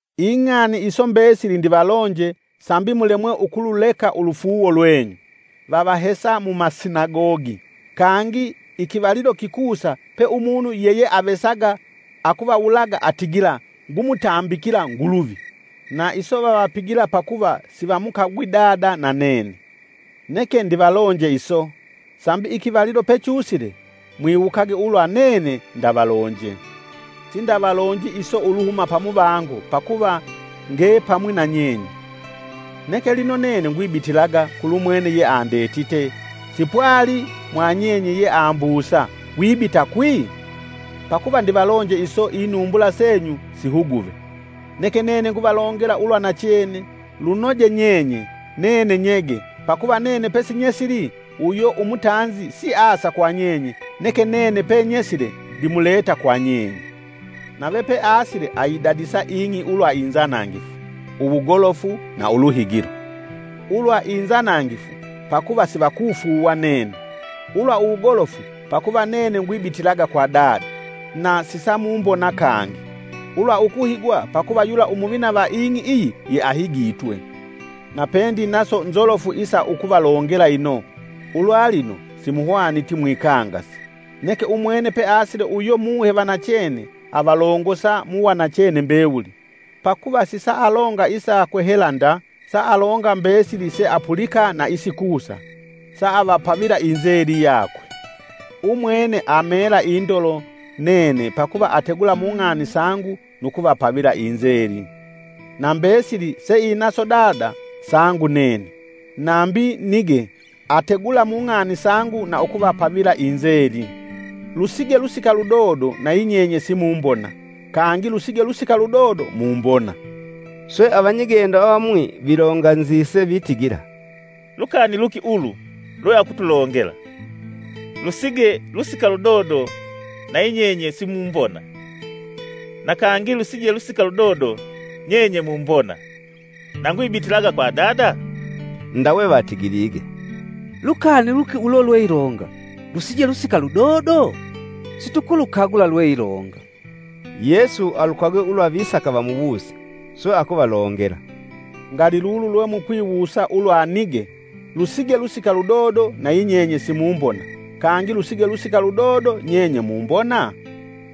“Ing'ani iso mbesili ndivalonje sambi mulemwe ukululeka ulufuuwo lwenyu. Vavahesa mumasinagogi. Kangi ikivalilo kikusa pe umunu yeyeavesaga akuvawulaga atigila ngumutambikila Nguluvi. Na iso vavapigila pakuva sivamukagwi Dada na nene. Neke ndivalonje iso, sambi ikivalilo pechusile mwiwukage ulwa nene ndavalonje. Ifipigo fya Umuhe Umwelu “Sindavalonji iso uluhuma pamuvango pakuva ngepamwi na nyenye. Neke lino nene ngwibitilaga kulumwene yeandetite sipwali mwanyenye yeambusa: ‘Wibita kwi?’ Pakuva ndivalonje iso inumbula senyu sihuguve. Neke nene nguvalongela ulwa nachene: lunoje nyenye, nene nyege pakuva nene pesinyesili uyo umutanzi siasa kwa nyenye neke nene penyesile ndimuleta kwa nyenye. Nave peasile ayidadisa ing'i ulwa inzanangifu, uwugolofu na uluhigilo. Ulwa inzanangifu, pakuva sivakufuuwa nene; ulwa uwugolofu pakuva nene gwibitilaga kwa Dada na sisamumbona kangi; ulwa ukuhigwa pakuva yula umuvina va mung'i iyi yeahigitwe. “Napendinaso nzolofu isa ukuvalongela, ino ulwalino simuhwaniti mwikangase. Neke umwene peasile uyo Muhe va nachene avalongosa mu wanachene mbewuli, pakuva sisaalonga isakwe hela nda, saalonga mbesili seapulika na isikusa, saavapavila inzeli yakwe. Umwene amela indolo nene pakuva ategula mung'ani sangu nu kuvapavila inzeli. Na mbesili seinaso Dada sangu nene; nambi nige ategula mung'ani sangu na ukuvapavila inzeli. “Lusige lusika ludodo nayinyenye simumbona, kangi lusige lusika ludodo mumbona!” Swe avanyigendo avamwi vilonganzise vitigila, “Lukani luki ulu lweakutulongela: ‘lusige lusika ludodo nayinyenye simumbona, na kangi lusige lusika ludodo nyenye mumbona’ na ngwibitilaga kwa Dada?’ Ndawe vatigilige, Lukani luki ulo lweilonga: ‘Lusige lusika ludodo?’ Situkulukagula lweilonga.” Yesu alukagwe ulwa visaka vamuwuse, swe akuvalongela, “Ngali lulu lwemukwiwusa ulwa nige: ‘Lusige lusika ludodo nayinyenye simumbona; kangi lusige lusika ludodo nyenye mumbona?’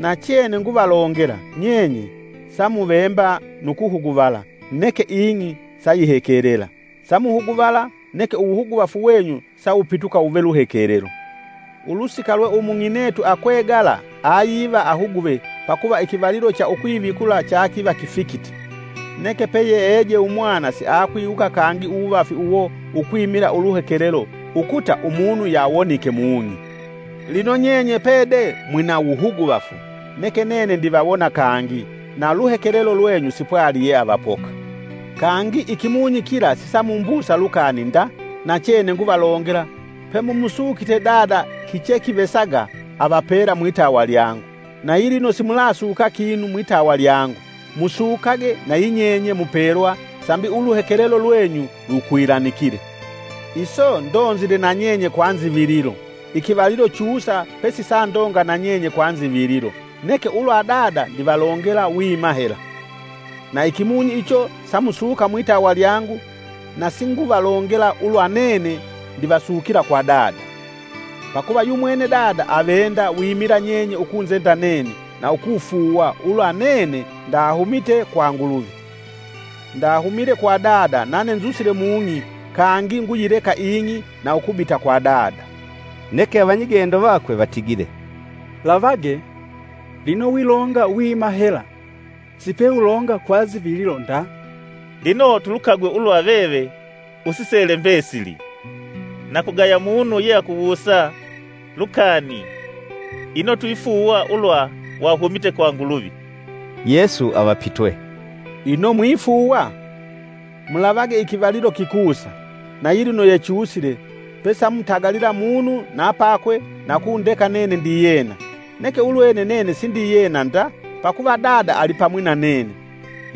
Nachene nguvalongela, nyenye samuvemba nu kuhuguvala neke ing'i sayihekelela, samuhuguvala, neke uwuhuguvafu wenyu sawupituka wuve luhekelelo. Ulusika lwe umung'inetu akwegala ayiva ahuguve pakuva ikivalilo cha ukwivikula chakiva kifikite, neke peyeeje umwana siakwiwuka kangi uwuvafi uwo ukwimila uluhekelelo ukuta umunu yawonike mung'i. Lino nyenye pede mwina wuhuguvafu. Neke nene ndivawona kangi na luhekelelo lwenyu sipwali yeavapoka. Kangi ikimunyi kila sisamumbusa lukani nda, nachene nguvalongela pemumusukite Dada kichekivesaga avapela mwitawa lyangu. Na yilino simulasuka kinu mwitawa lyangu; Musukage nayinyenye mupelwa sambi uluhekelelo lwenyu lukwilanikile. “Iso ndonzile na nyenye kwa nzivililo. Ikivalilo chusa pesisandonga na nyenye kwa nzivililo, neke ulwa Dada ndivalongela wima hela. Na ikimunyi icho samusuka mwitawa lyangu na singuvalongela ulwa nene ndivasukila kwa Dada; pakuva yumwene Dada avenda wimila nyenye ukunzenda nene, na ukufuuwa ulwa nene ndahumite kwa Nguluvi. Ndahumile kwa Dada nane nzusile mung'i kangi nguyileka ing'i na ukubita kwa Dada.” Neke avanyigendo vakwe vatigile, “Lavage! lino wilonga wima hela sipeulonga kwa nzivililo nda. Lino tulukagwe ulwa veve usisele mbesili na kugaya munu yeakuwusa lukani ino twifuuwa ulwa wahumite kwa Nguluvi.” Yesu avapitwe, “Ino mwifuuwa? Mulavage ikivalilo kikusa, na yilino yechusile pesamutagalila munu na pakwe na ukundeka nene ndiyena. Neke ulwene nene sindiyena nda, pakuva Dada alipamwi na nene.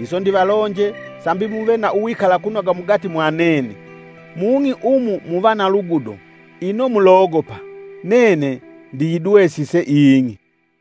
Iso ndivalonje sambi muve na uwikalakunoga mugati mwa nene. Mung'i umu muva na lugudo ino mulogopa! Nene ndiyidwesise ing'i!”